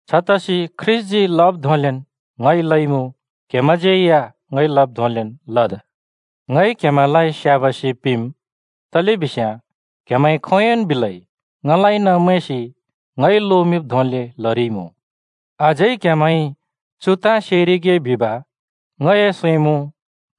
छतसि ख्रीष्‍टजी लब् धोंलेन् ङइ लइमुँ, क्‍हेमैंज्‍यै या ङइ लब् धोंलेन् लद्। ङइ क्‍हेमैंलाइ स्‍याबासि पिंम्, तलेबिस्याँ क्‍हेमैंइ खोंयोंन् बिलै ङलाइन मैंसि ङइ लोमिंब् धोंले लरिइमुँ। अझै क्‍हेमैंइ चु ताँ सेरिगे बिब ङए सैं मुँ: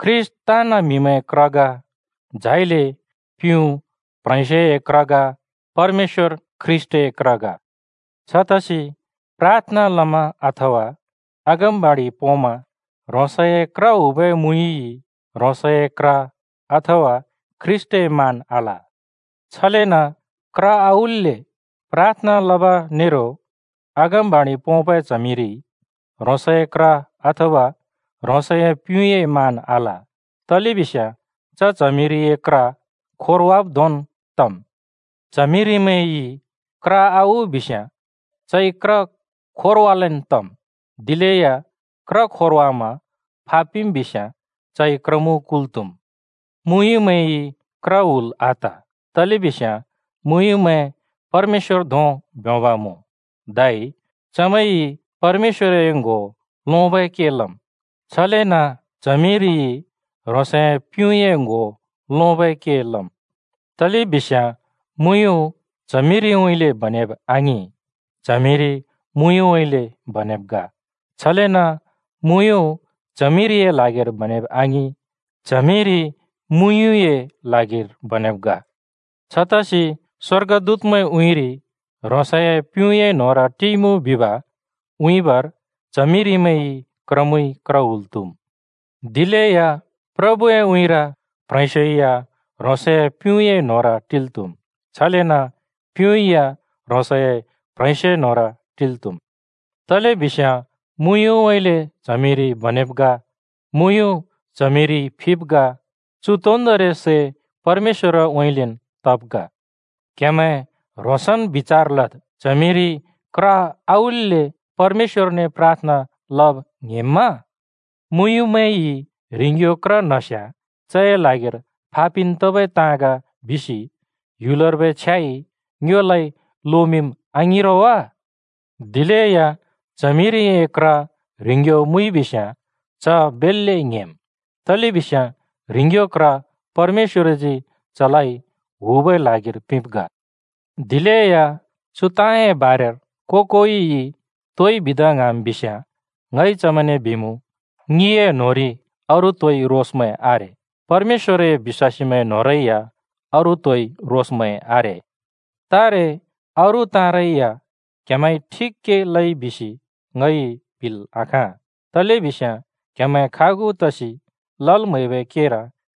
ख्रीष्‍ट ताँन् म्हिमैंए क्र ग, झाइले प्युँ प्ह्रेंस्योए क्र ग, परमेश्‍वर ख्रीष्‍टए क्र ग। छतसि प्राथना लमा अथवा अगमबाणि पोंमा ह्रोंसए क्र हुबै मुँयुँइ ह्रोंसए क्र [अथवा ख्रीष्‍टए] मान आल। छलेन क्र आउल्‍ले प्राथना लब नेरो अगमबाणि पोंबै च्हमिरिइ ह्रोंसए क्र [अथवा ह्रोंसए प्युँए] मान आल, तलेबिस्याँ च च्हमिरिए क्र खोरवाब् धोंन् तम्। च्हमिरिमैंइ क्र आउ बिस्‍याँ चइ क्र खोरवालेन् तम्। दिलेया क्र खोरवामा फा पिम् बिस्याँ चइ क्रमुँ कुल् त्‍हुम् मुँयुँमैंइ क्र हुल आत, तलेबिस्याँ मुँयुँमैं परमेश्‍वर धों ब्योंब मुँ धै चमैंइ परमेश्‍वरए ङ्‍हो लोंबै के लम्। छलेन च्हमिरिइ ह्रोंसए प्युँए ङ्‍हो लोंबै के लम्। तलेबिस्याँ मुँयुँ च्हमिरिउँइँले बनेब आङिं, च्हमिरि मुँयुँउँइँले बनेब् ग। छलेन मुँयुँ च्हमिरिए ल्हागिर बनेब आङिं, च्हमिरि मुँयुँए ल्हागिर बनेब् ग। छतसि स्वर्गदूतमैंए उँइँरि ह्रोंसए प्युँए न्होंर टिइमुँ बिब् उँइँबर च्हमिरिमैंइ क्रमुँइ क्र हुल् त्हुम्। दिलेया प्रभुए उँइँर, प्ह्रेंस्यो या ह्रोंसए प्युँए न्होंर टिल् त्हुमुँ, छलेन प्युँ या ह्रोंसए प्ह्रेंस्योए न्होंर टिल् त्हुम्। तलेबिस्याँ मुँयुँउँइँले च्हमिरि बनेब् ग, मुँयुँ च्हमिरिइ फिब् ग। चु तोन्दोंरि सै परमेश्‍वरउँइँलेन् तब् ग। क्हेमैं ह्रोंसन् बिचार लद्, च्हमिरिइ क्र आउल्‍ले परमेश्‍वरने प्राथना लब ङ्‍हेंम्‍मा? मुँयुँमैंइ ह्रिंग्‍यो क्र न्‍हस्‍याँ चए ल्हागिर फापिन् तबै ताँ ग बिसि ह्‍युलर्बै छ्याइ ङ्योलाइ लोमिंम्, आङिं रो वा? दिलेया च्हमिरिए क्र ह्रिंग्‍यो मुइबिस्‍याँ च बेल्‍ले ङ्‍हेंम्। तलेबिस्याँ ह्रिंग्‍यो क्र परमेश्‍वरजी चलाइ हुबै ल्हागिर पिंब् ग। दिलेया चु ताँए बारेर को-कोइइ तोइ बिदा ङ्हाँम् बिस्‍याँ ङइ चमैंने बिमुँ, ङिए न्होंरि अरू तोइ रोसमैं आरे, परमेश्‍वरए बिश्‍वासीमैं न्‍होंरै या अरू तोइ रोसमैं आरे। तारे अरू ताँरै या क्हेमैंइ ठिक के लइ बिसि ङइ बिल् आखाँ, तलेबिस्याँ क्‍हेमैं खागु तसि लल् म्हैबै केर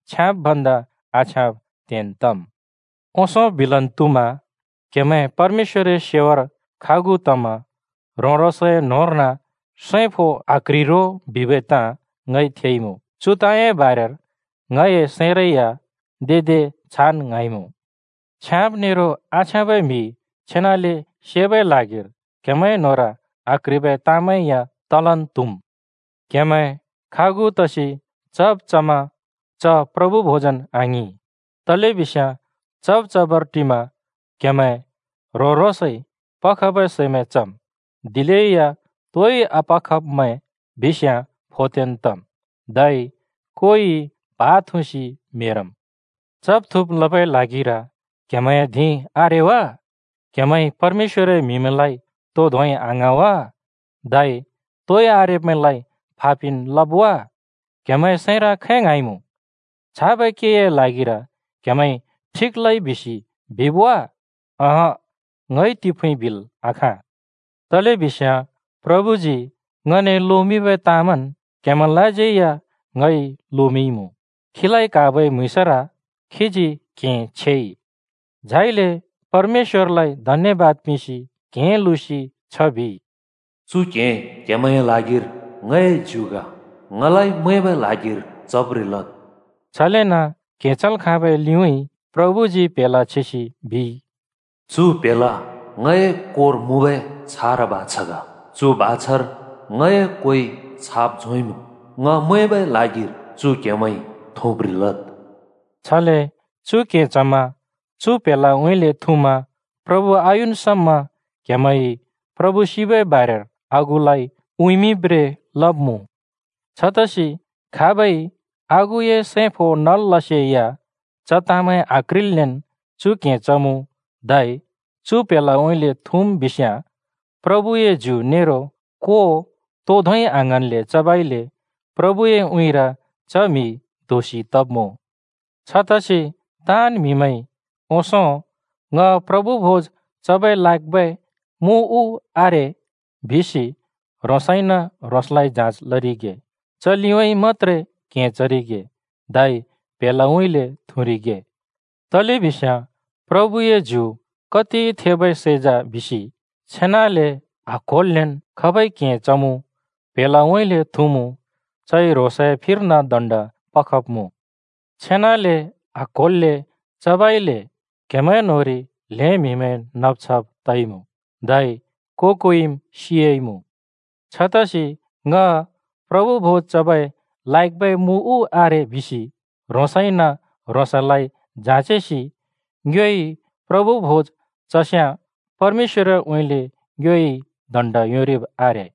छ्याँब् भन्दा आछ्याँब् त्हेन् तम्। ओंसों बिलन् त्हुमा, क्‍हेमैं परमेश्‍वरए सेवार खागु तमा ह्रों-ह्रोंसए न्‍होंर्न सैं फो आक्ह्रि रो बिबै ताँ ङइ थेइमुँ। चु ताँए बारेर ङए सैंरै या दे दे छान् ङ्हाँइमुँ। (छ्याँब नेरो आछ्याँबै म्‍हि छेनाले सेबै ल्हागिर क्‍हेमैं न्‍होंर आक्ह्रिबै ताँमैं या तलन् त्हुम्।) क्‍हेमैं खागु तसि चब् चमा च प्रभु भोजन् आङिं, तलेबिस्याँ चब् चबर टिमा क्‍हेमैं ह्रों-ह्रोंसइ पखबै सैमैं चम्, दिलेया तोइ आपखब्मैं बिस्याँ फोत्तेन् तम्, धै कोइ प्हा थुँसि म्हेरम्। चब् थुँब् लबै ल्हागिर क्हेमैंए धिं आरे वा? क्‍हेमैंइ परमेश्‍वरए म्हिमैंलाइ तो धोंइ आङ्हाँ वा, धै तोइ आरेब्‍मैंलाइ फा पिन् लब् वा? क्‍हेमैंए सैंर खै ङ्हाँइमुँ? छाबै केए ल्हागिर क्हेमैंइ ठिक लइ बिसि बिब् वा? अँहँ, ङइ तिफुँइ बिल् आखाँ। तलेबिस्याँ प्रभुजी ङने लोमिंबै ताँमैंन् क्हेमैंलाज्यै या ङइ लोमिंइमुँ। खीलाइ क्हाबै म्‍हुँइँसर खीजी क्‍हें छेइ, झाइले परमेश्‍वरलाइ धन्‍यबाद पिंसि क्‍हें लुँसि छ बिइ, “चु क्‍हें क्‍हेमैंए ल्हागिर ङए ज्यु ग। ङलाइ मैंबै ल्हागिर चब्रें लद्।” छलेन क्हें चल् खाँबै लिउँइँ प्रभुजी प्‍हेला छेसि बिइ, “चु प्‍हेला ङए कोर मुँबै छारा बाछा ग। चु बाछार ङए कोइ छाप झोंइमुँ। ङ मैंबै ल्हागिर चु क्‍हेमैंइ थुँब्रें लद्।” छले चु क्‍हें चमा, चु प्‍हेलाउँइँले थुँमा प्रभु आयुन् समा क्‍हेमैंइ प्रभु सिबै बारेर आगुलाइ उँइँमिंब्रें लब्मुँ। छतसि खाबइ आगुए सैं फो नल् लसेया च ताँमैं आक्ह्रिल्‍लेन् चु क्‍हें चमुँ, धै चु प्‍हेलाउँइँले थुँम् बिस्याँ, प्रभुए ज्यु नेरो को तो धोंइ आङ्हाँन्ले चबइले प्रभुए उँइँर च म्‍हि दोषि तब्‍मुँ। छतसि ताँन् म्‍हिमैंइ ओंसों “ङ प्रभु भोज चबर लायकबै मुँ उ आरे?” बिसि ह्रोंसइन ह्रोंसलाइ जाँचेरिगे। च लिउँइँ मत्‍त्रे क्‍हें चरिगे धै प्‍हेलाउँइँले थुँरिगे। तलेबिस्याँ प्रभुए ज्यु कति थेबै सै जा बिसि छेनाले आक्होल्‍लेन् खाबइ क्‍हें चमुँ, प्‍हेलाउँइँले थुँमुँ चइ ह्रोंसए फिर्न दण्ड पखब्मुँ। छेनाले आक्होल्‍ले चबइले क्‍हेमैं न्‍होंरि ल्हें म्‍हिमैं नब छब तइमुँ, धै को-कोइम् सियाइमुँ। छतसि “ङ प्रभु भोज चबै लायकबै मुँ उ आरे?” बिसि ह्रोंसइन ह्रोंसलाइ जाँचेसि ङ्योइ प्रभु भोज चस्‍याँ परमेश्‍वरउँइँले ङ्योइ दण्ड योंरिब् आरे।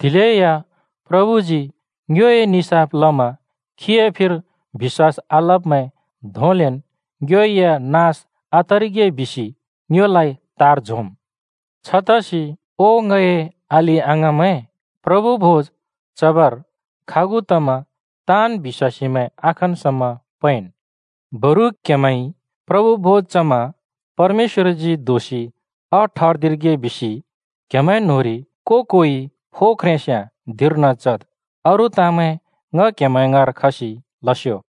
दिलेया प्रभुजी ङ्योए निसाफ लमा खीए फिर बिश्‍वास आलब्मैं धोंलेन् ङ्यो या नास आतरिगे बिसि ङ्योलाइ तार झोंम्। छतसि ओ ङए अलि-अङाँमैं, प्रभु भोज चबर खागु तमा ताँन् बिश्‍वासीमैं आखन् समा पैंन्। बरु क्‍हेमैंइ प्रभु भोज चमा परमेश्‍वरजी दोषि आठर्दिरिगे बिसि क्‍हेमैं न्‍होंरि को-कोइ फो ख्रेंस्‍याँ धिंर्न चद्। अरू ताँमैं ङ क्‍हेमैं ङाँर खसि लस्यो।